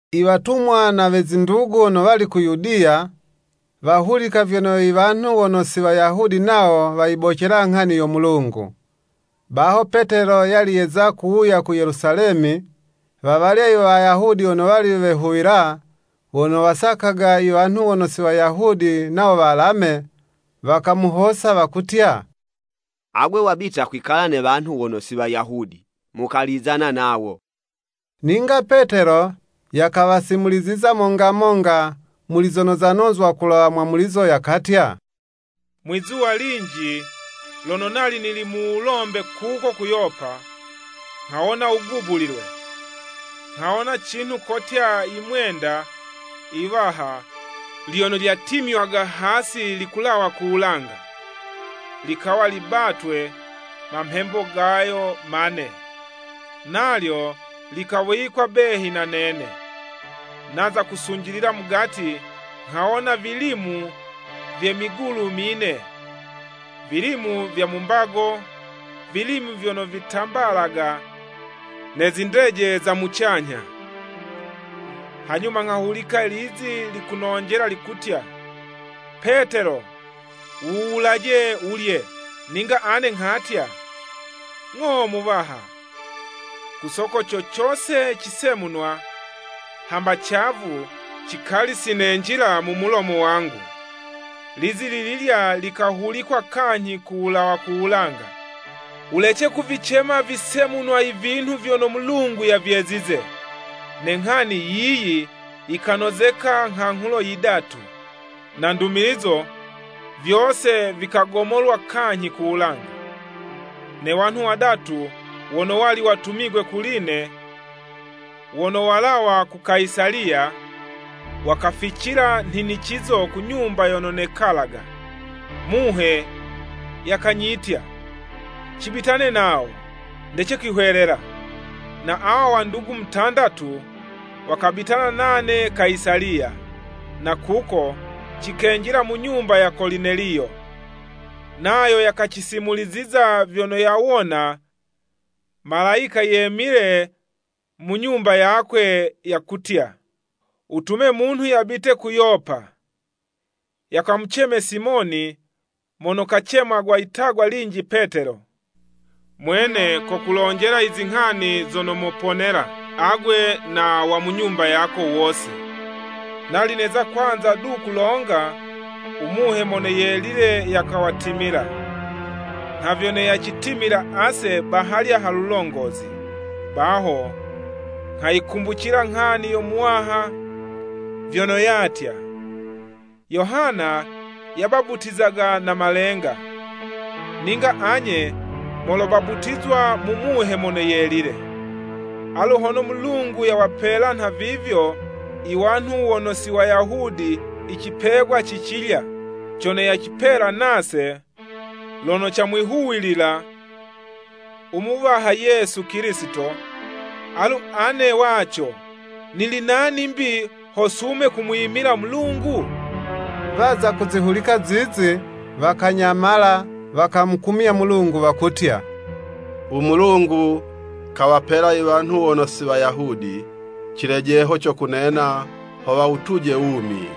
Iwatumwa na we zindugu wono wali ku Yudiya, wahulika vyono i wanhu wono si Wayahudi nawo wayibocela nghani yo Mulungu. Baho Petelo yali yeza kuwuya ku Yelusalemi, wawalya Iwayahudi wono wali wehuwila, wono wasakaga i wanhu wono si Wayahudi nawo walame, wakamuhosa, wakutya, “Agwe wabita kwikala ne wanhu wono si Wayahudi, mukalizana nawo!” Ninga Petelo, yakawasimuliziza monga monga, muli zono zanozwa kulawa mwamulizo, yakatya, “Mwi'zuwa linji lono nali nili mu wulombe kuko ku Yopa, nghawona wugubulilwe, nghawona cinhu kotya yimwenda yiwaha lyono lyatimywaga hasi likulawa ku wulanga, likawa libatwe mamhembo gayo mane, nalyo likawikwa behi na nene. Naza kusunjilila mugati, nghawona vilimu vye migulu mine, vilimu vya mu mbago, vilimu vyono vitambalaga ne zindeje za mucanyha. Hanyuma nghahulika lizi likunonjela likutya, ‘Petelo, wuwulaje, wulye.’ Ninga ane nghatya, ‘Ng'o Muwaha, ku soko co cose cisemunwa, hamba cavu, cikali sinenjila mu mulomo wangu.’ Lizi lililya likahulikwa kanyhi kulawa ku wulanga, ‘Wulece kuvicema visemunwa ivinhu vyono Mulungu yavyezize.’ Ne nghani yiyi yikanozeka nghanghulo yidatu, na ndumilizo, vyose vikagomolwa kanyhi ku wulanga. Ne wanhu wadatu, wono wali watumigwe kuli'ne, wono walawa ku Kayisaliya, wakaficila nhinicizo ku nyumba yono nekalaga. Muhe yakanyitya cibitane nawo, ndece kwihwelela. Na awa wandugu mutandatu, wakabitana nane Kayisaliya, na kuko cikenjila mu nyumba ya Kolineliyo. Nayo yakacisimuliziza vyono yawona Malayika yemile mu nyumba yakwe yakutya, ‘Wutume munhu yabite ku Yopa, yakamuceme Simoni, mono kacemwaga litagwa linji Petelo. Mwene kokulonjela izinghani zono moponela, agwe na wa mu nyumba yako wose.’ Nali neza kwanza du kulonga, u Muhe Mono Yelile yakawatimila, nha vyono yacitimila ase bahalya ha lulongozi. Baho nghayikumbucila nghani yo Muwaha vyono yatya, ‘Yohana yabaputizaga na malenga, ninga anye molobaputizwa mu Muhe Mono Yelile.’ Alu hono Mulungu yawapela nhavivyo i wanhu wono si Wayahudi icipegwa ci cilya cono yacipela nase, lono camwihuwilila u Muwaha Yesu Kilisito, alu ane waco nili nani 'mbi, ho sume kumwimila Mulungu?” Waza kuzihulika zizi, wakanyamala, wakamukumya Mulungu wakutya, “U Mulungu kawapela i wanhu wono si Wayahudi cilejeho co kunena ho wawutuje wumi!”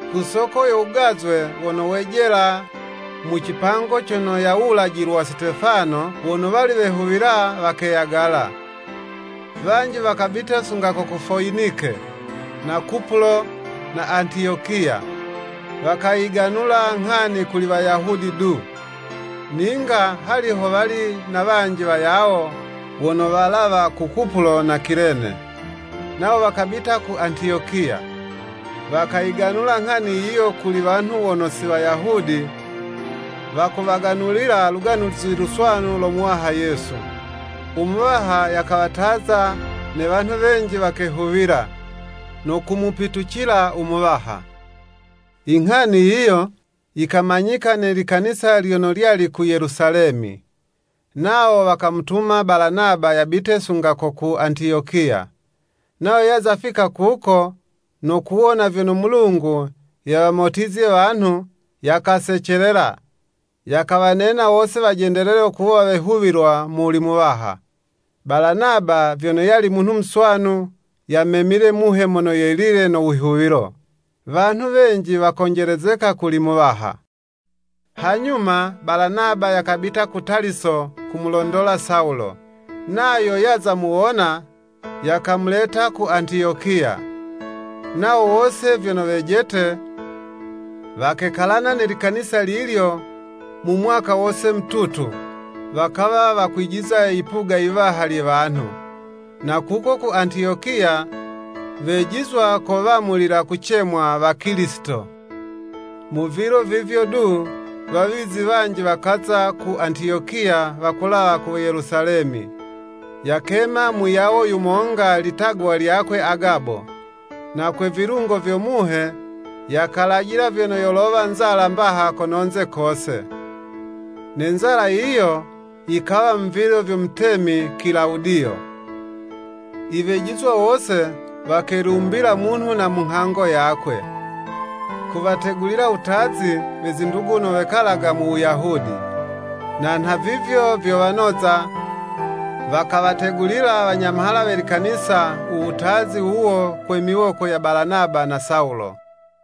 Ku soko yo wugazwe, wono wejela mu cipango cono yawulajilwa Sitefano, wono wali wehuwila wakeyagala. Wanji wakabita sunga ko ku Foyinike, na Kupulo, na Antiyokiya, wakayiganula nghani kuli Wayahudi du. Ninga hali ho wali na wanji wayawo, wono walawa ku Kupulo na Kilene, nawo wakabita ku Antiyokiya, wakayiganula nghani yiyo kuli wanhu wono si Wayahudi, wakuwaganulila Luganuzi Luswanu lo Muwaha Yesu. U Muwaha yakawataza, ne wanhu wenji wakehuwila, no kumupitucila u Muwaha. Inghani yiyo yikamanyika ne likanisa lyono lyali ku Yelusalemi. Nawo wakamutuma Balanaba yabite sunga ko ku Antiyokiya. Nayo yaza fika kuko, no kuwona vyono Mulungu yawamotizye wanhu, yakasecelela, yakawanena wose wajendelele kuwa wehuwilwa muli Muwaha. Balanaba vyono yali munhu muswanu, yamemile Muhe Mono Yelile, no wihuwilo. Wanhu wenji wakonjelezeka kuli Muwaha. Hanyuma Balanaba yakabita ku Taliso kumulondola Sawulo. Nayo yaza muwona, yakamuleta ku Antiyokiya. Nawo wose vyono wejete, wakekalana ne likanisa lilyo, mu mwaka wose mututu, wakawa wakwijiza yipuga yiwaha lye wanhu. Na kuko ku Antiyokiya, wejizwa ko wamulila kucemwa Wakilisito. Mu vilo vivyo du, wawizi wanji wakaza ku Antiyokiya wakulawa ku Yelusalemi. Yakema muyawo yumonga litagwa lyakwe Agabo, na kwe vilungo vyo Muhe, yakalajila vyono yolowa nzala mbaha kono'nze kose. (Ne nzala yiyo yikawa mu vilo vyo mutemi Kilawudiyo.) Iwejizwa wose wakelumbila munhu na ha nghango yakwe, kuwategulila wutazi, we zindugu wono wekalaga mu Wuyahudi. Na nhavivyo vyo wanoza, wakawategulila wanyamhala we likanisa u wutazi wuwo kwe miwoko ya Balanaba na Sawulo.